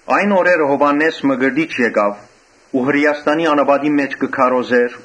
Այն օրերը Յովհաննէս Մկրտիչ եկաւ ու Հրէաստանի անապատին մէջ կը քարոզէր,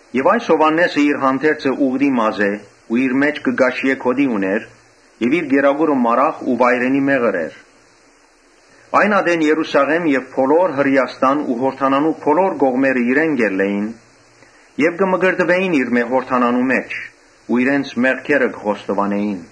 Յովհաննէսին հանդերձը ուղտի մազէ էր ու իր մէջքը կաշիէ գօտի ունէր եւ իր կերակուրը մարախ ու վայրենի մեղր էր։ Այն ատեն Երուսաղէմ եւ բոլոր Հրէաստան ու Յորդանանի բոլոր կողմերէն իրեն կու գային Եւ կը մկրտուէին իրմէ Յորդանանի մէջ ու իրենց մեղքերը կը խոստովանէին։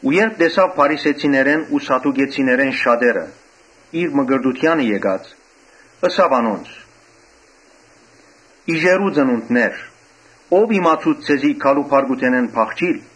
Երբ տեսաւ փարիսեցիներէն ու սադուկեցիներէն շատեր, որ իր մկրտութեանը եկած էին, ըսաւ. «Իժերո՛ւ ծնունդներ, ո՞վ իմացուց ձեզի գալու բարկութենէն փախչիլ։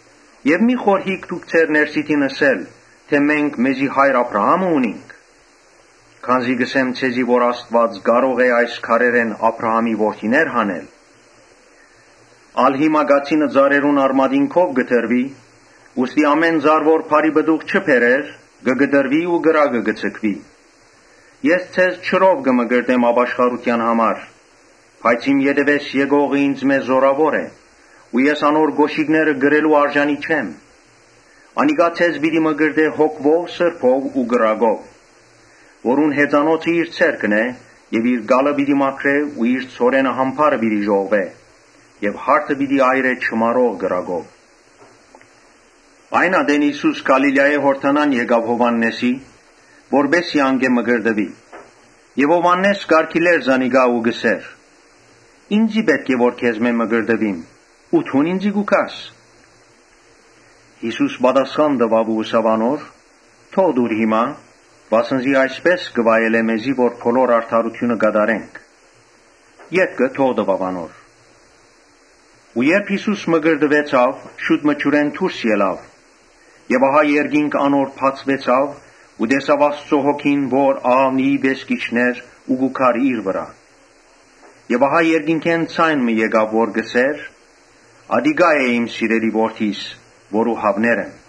Եւ մի՛ խորհիք դուք ձեր ներսիդին, թէ ‘Մենք մեզի հայր՝ Աբրահամը ունինք’. քանզի կ’ըսեմ ձեզի թէ Աստուած կարող է այս քարերէն Աբրահամի որդիներ հանել։ Ալ հիմա կացինը ծառերուն արմատին քով կը դրուի. ուստի ամէն ծառ որ բարի պտուղ չի բերեր, կը կտրուի ու կրակը կը ձգուի։ Ես ձեզ ջրով կը մկրտեմ ապաշխարութեան համար, բայց իմ ետեւէս եկողը ինծմէ զօրաւոր է։ Ես անոր կօշիկները կրելու արժանի չեմ։ Անիկա ձեզ պիտի մկրտէ Սուրբ Հոգիով ու կրակով. Որուն հեծանոցը իր ձեռքն է եւ իր կալը պիտի մաքրէ ու իր ցորենը ամբարը պիտի ժողվէ եւ յարդը պիտի այրէ չմարող կրակով»։ Այն ատեն Յիսուս Գալիլիայէն Յորդանան եկաւ Յովհաննէսին, որպէս զի անկէ մկրտուի։ Յովհաննէս կ’արգիլէր զանիկա ու կ’ըսէր. «Ինծի պէտք է որ քեզմէ մկրտուիմ ու դուն ինծի՞ կու գաս»։ Յիսուս պատասխան տուաւ ու ըսաւ անոր. «Թող տուր հիմա, վասն զի այսպէս կը վայելէ մեզի, որ բոլոր արդարութիւնը կատարենք»։ Ետքը թող տուաւ անոր։ Երբ Յիսուս մկրտուեցաւ, շուտ մը ջուրէն դուրս ելաւ եւ ահա երկինքը բացուեցաւ ու տեսաւ Աստուծոյ Հոգին, որ աղաւնիի պէս կ’իջնէր ու կու գար իր վրայ։ Եւ ահա երկնքէն ձայն մը եկաւ որ կ’ըսէր. «Ասիկա է իմ սիրելի Որդիս, որուն հաւներ եմ»։